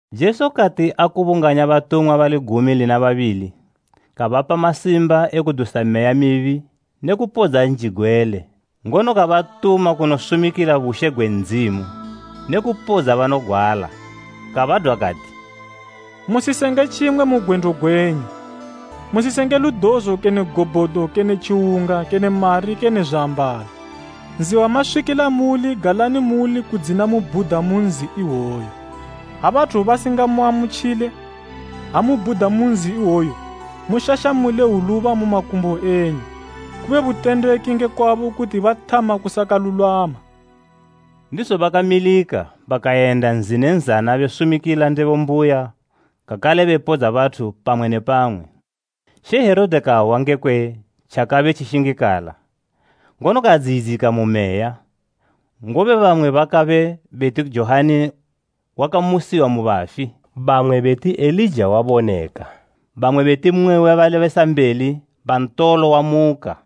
Jesu kati akubunganya batumwa bali gumi lina babili, kabapa masimba e kudusa meya mibi ne kupodza njigwele, ngono kabatuma kunosumikila bushe gwe Ndzimu ne kupodza banogwala. Kabadwa kati, “Musisenge tjimwe mu gwendo gwenyu, musisenge ludozo kene gobhodo kene tjiwunga kene mari kene zwiambalo. Nzi wamaswikila muuli galani muuli kudzina mubhuda mu nzi iwoyo. Ha bathu basingamuamutjile, ha mubhuda mu nzi iwoyo mushashamule hwuluba mu makumbo enyu, kube butendeki nge kwabo kuti bathama kusakalulwama.” Ndizo bakamilika, bakayenda nzi ne nzana besumikila ndebo mbuya kakale bepodza bathu pamwe ne pamwe. She Herode kahwa ngekwe tjakabe tjishingikala. Ngono kadziyidzika mu meya, ngobe bamwe bakabe beti Johani wakamusiwa mu bafi, bamwe beti Elija waboneka, bamwe beti mmwe we balebesambeli ba ntolo wamuka.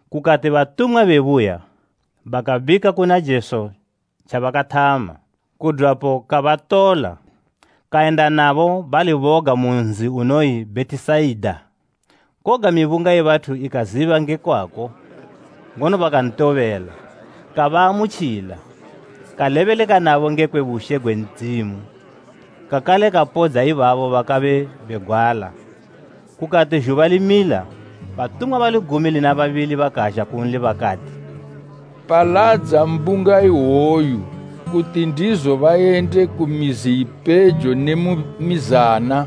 Kukati batumwa bebuya, bakabika kuna Jesu tjabakathama. Kudwapo kabatola, kayenda nabo bali boga mu nzi unoyi Bhetisaida, koga mibunga ye bathu ikaziba nge kwako, ngono bakantobela. Kabaamutjila, kalebeleka nabo ngekwe bushe gwe Ndzimu, kakale kapodza ibabo bakabe begwala. Kukati zhuba limila, batumwa bali gumi lina babili bakazha kunli bakati, “Paladza mbunga iwoyu, kuti ndizo bayende ku mizi ipejo ne mu mizana,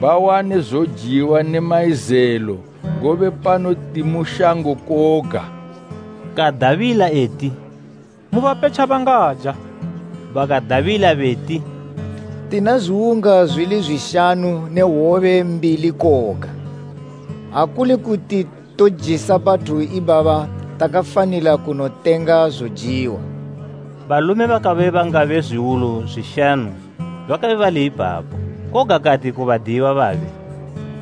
bawane zojiwa ne mayizelo, ngobe pano timu shango koga.” Kadabila eti, “Mubape tjabangaja.” Bakadabila beti, “Tina zwiwunga zwili zwishanu ne hwobe mbili koga. Ha kuli kuti tojisa bathu ibaba takafanila kunotenga zojiwa.” Balume bakabe bangabe zwiwulu zwishanu bakabe bali ipapo. Koga kati ku badiyiwa babe,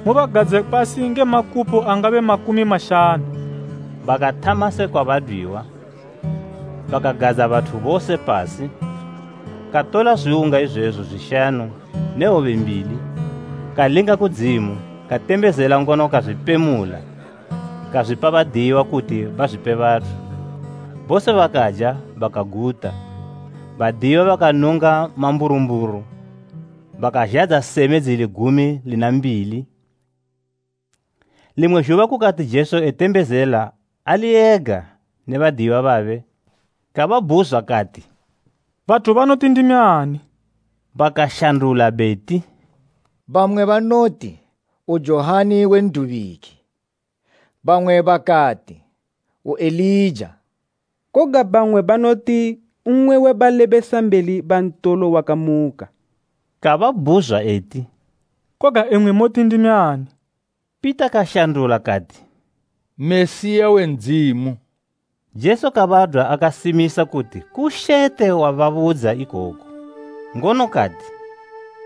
“Mubagadze pasi nge makupo angabe makumi mashanu.” Bakathama sekwa badwiwa, bakagadza bathu bose pasi. Katola zwiwunga izwezo zwishanu ne hwobe mbili, kalinga kudzimu, katembezela ngono kazwipemula, kazwipa badiyiwa kuti bazwipe bathu. Bose bakaja bakaguta, badiyiwa bakanunga mamburumburu bakazhadza seme dzili gumi lina mbili. Limwe zhuba kukati Jesu etembezela ali ega ne badiyiwa babe, kababhuzwa kati, “Bathu banoti ndimi ani?” Bakashandula beti, “Bamwe banoti, u Johani we N'dubiki, bamwe bakati, u Elija, koga bamwe banoti, mmwe we balebesambeli ba ntolo wakamuka.” Kababhuzwa eti, “Koga imwi moti ndimi ani?” Pita kashandula kati, “Mesiya we Ndzimu.” Jesu kabadwa akasimisa kuti kushete wababudza ikoku. Ngono kati,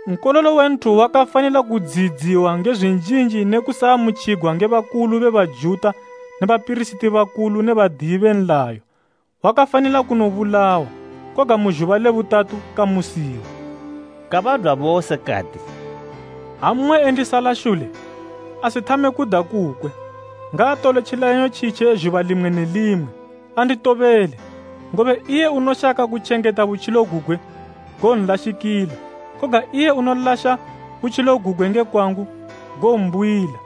“Nkololo we Nthu wakafanila kudziyidziwa nge zwinjinji ne kusaamutjigwa nge bakulu be Bajuta ne bapirisiti bakulu ne badiyi be nlayo, wakafanila kunobulawa, koga mu zhuba le butatu, kamusiwa.” Kabadwa bose kati, “Ha mmwe endisala shule, asithame kuda kukwe, ngaatole tjileyanyo tjitje zhuba limwe ne limwe, andi tobele. Ngobe iye unoshaka kutjengeta butjilo gugwe, gowonlashikila, koga iye unolasha butjilo gugwe nge kwangu, gowombuyila.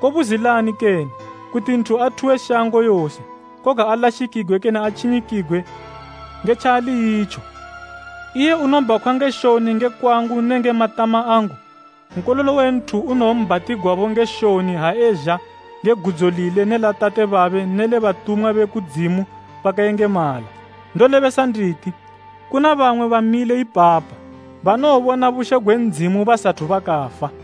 Kobuzilani kene, kuti nthu athuwe shango yose, koga alashikigwe kene atjinyikigwe nge tjaali itjo? Iye unobhakhwa nge shoni nge kwangu nenge matama angu, Nkololo we Nthu unowombhatigwabo nge shoni ha ezha nge gudzo lile ne la Tate babe ne le batumwa be kudzimu bakayengemala. Ndolebesa nditi, kuna bamwe bamile ipapa banowobona bushe gwe Ndzimu basathu bakafa.”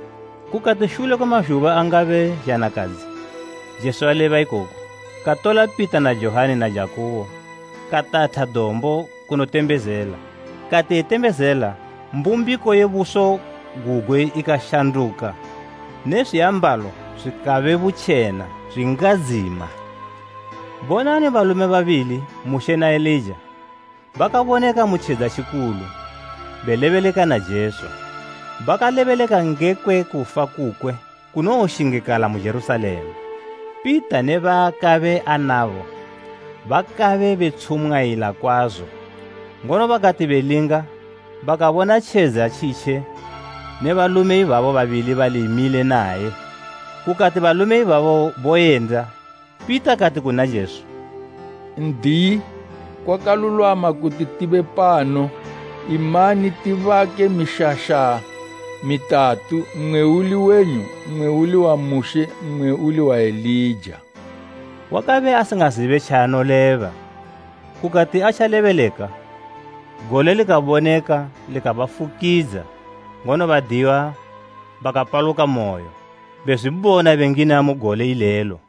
Kukati Shule kwe mazhuba angabe zhanakadzi Jesu aleba ikoku, katola Pita na Johani na Jakubo katatha dombo kunotembezela. Kati etembezela, mbumbiko ye buso gugwe ikashanduka ne zwiambalo zwikabe butjena zwingadzima. Bonani Balume babili, Mushe na Elija, bakaboneka mu tjedza tjikulu, belebeleka na Jesu. Bakalebeleka ngekwe kufa kukwe kunowoshingikala mu Jerusalema. Pita ne baakabe anabo bakabe betshung'ayila kwazo, ngono bakati belinga bakabona tjedza tjitje ne balume ibabo babili bali mile naye. Kukati balume ibabo boyenda, Pita kati kuna Jesu, “N'diyi, kwakalulwama kuti tibe pano. Imani tibake mishasha mitatu, mmwe uli wenyu, mmwe uli wa Mushe, mmwe uli wa Elija.” Wakabe asingazibe tjaanoleba. Kukati atjalebeleka, gole likaboneka likabafukidza, ngono badiyiwa bakapalukamoyo, bezwibona bengina mu gole ilelo.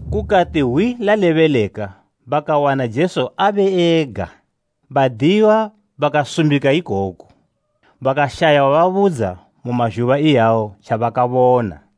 Kukati hwi lalebeleka bakawana Jesu abe ega. Badiyiwa bakasumbika ikoku, bakashaya wababudza mu mazhuba iyawo tjabakabona.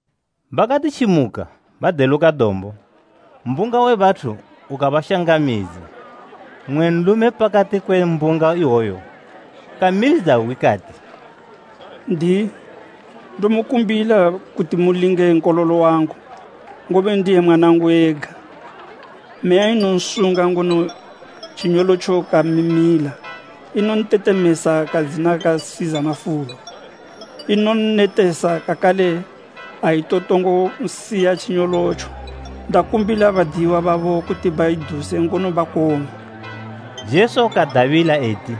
Bakati tjimuka, badeluka dombo, mbunga we bathu ukanshangamidza. Mmwe nlume pakati kwe mbunga iwoyo kamilidza hwi kati, “N'diyi, ndomukumbila kuti mulinge nkololo wangu, ngobe ndiye mwanangu ega. Meya inonsunga ngono tjinyolotjo kamimila, inontetemesa kadzina kasiza mafulo. Inonnetesa kakale aitotongo nsiya tjinyolotjo. Ndakumbila badiyiwa babo kuti baiduse ngono bakong'wa.” Jesu kadabila eti,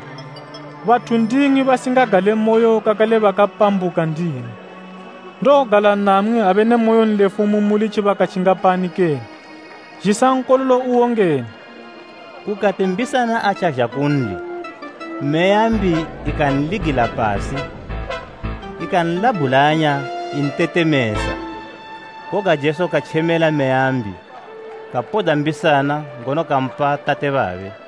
“Bathu basingagalemoyo kakale bakapambuka ndimwi! Ndowogala namwi abe ne moyonlefu mu muli tjibaka tjingapani kene? Zhisa nkololo uwo ngeno.” Kukati mbisana atjazha kunli, meya mbi ikanligila pasi ikanlabhulanya intetemesa. Koga Jesu katjemela meya mbi, kapodza mbisana ngono kampa tate babe.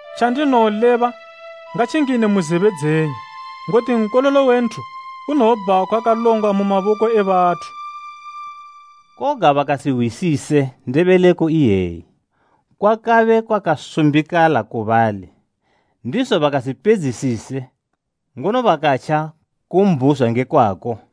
“Tjandinowoleba, ngatjingine mu zebe dzenyu. Ngoti Nkololo we Nthu unowobhakhwa kalongwa mu maboko e bathu.” Koga bakasihwisise ndebeleko iyeyi. Kwakabe kwakasumbikala ku bali, ndizo bakasipedzisise, ngono bakatja kumbhuzwa nge kwako.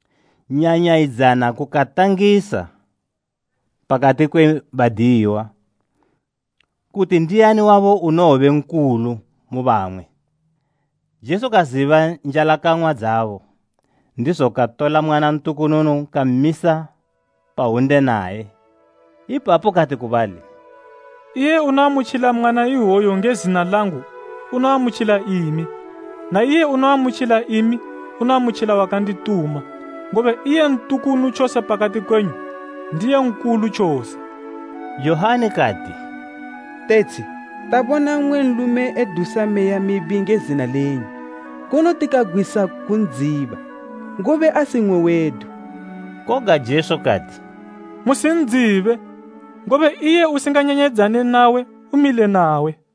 Nyanyayidzana kukatangisa pakati kwe badiyiwa, kuti ndiani wabo unowobe nkulu mu bamwe. Jesu kaziba njalakang'wa dzabo, ndizo katola mwana ntukununu kammisa pahwunde naye. Ipapo kati ku bali, “Iye unoamutjila mwana iwoyu nge zina langu unoamutjila imi, na iye unoamutjila imi unoamutjila wakandituma, ngobe iye ntukunu tjose pakati kwenyu, ndiye nkulu tjose.” Johani kati, “Tetshi, tabona mmwe nlume edusa meya mibi nge zina lenyu, ngono tikagwisa kun'dziba, ngobe asi mmwe wedu.” Koga Jesu kati, “Musin'dzibe, ngobe iye usinganyanyayidzane nawe, umile nawe.”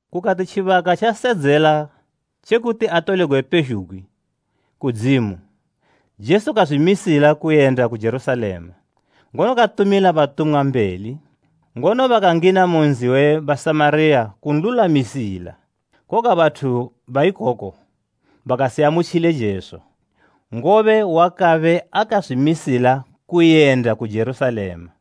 Kukati tjibaka tjasedzela tjekuti atolegwe pezhugwi, kudzimu, Jesu kazwimisila kuyenda ku Jerusalema, ngono katumila batumwa mbeli. Ngono bakangina mu nzi we Basamariya kunlulwamisila. Koga bathu ba ikoko bakasiamutjile Jesu, ngobe wakabe akazwimisila kuyenda ku Jerusalema.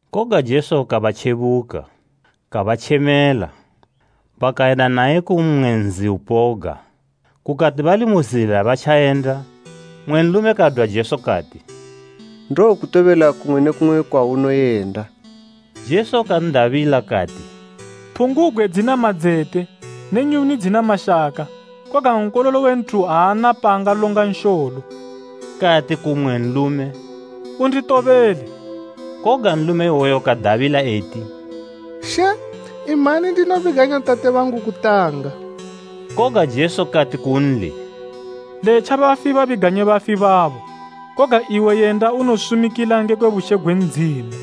Koga Jesu kabatjebuka, kabatjemela. Bakayenda naye ku mmwe nzi upoga. Kukati bali mu zila batja yenda, mmwe nlume kadwa Jesu kati, “Ndowokutobela kumwe ne kumwe kwaunoyenda.” Jesu kan'dabila kati, “Phungubgwe dzina madzete ne nyuni dzina mashaka, koga Nkololo we Nthu aana paangalonga nsholo.” Kati ku mmwe nlume, “Unditobele.” Koga nlume iwoyo kadabila eti, “She, imani ndinobiganya tate bangu kutanga.” Koga Jesu kati kunli, “Letja bafi babiganye bafi babo, koga iwe yenda unosumikila ngekwe bushe gwe Ndzimu.”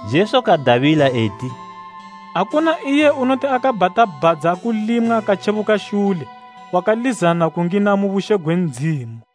Jesu kadabila eti, “Akuna iye unoti akabhata bhadza kulimwa katjebuka shule wakalizana kungina mu bushe gwe Ndzimu.”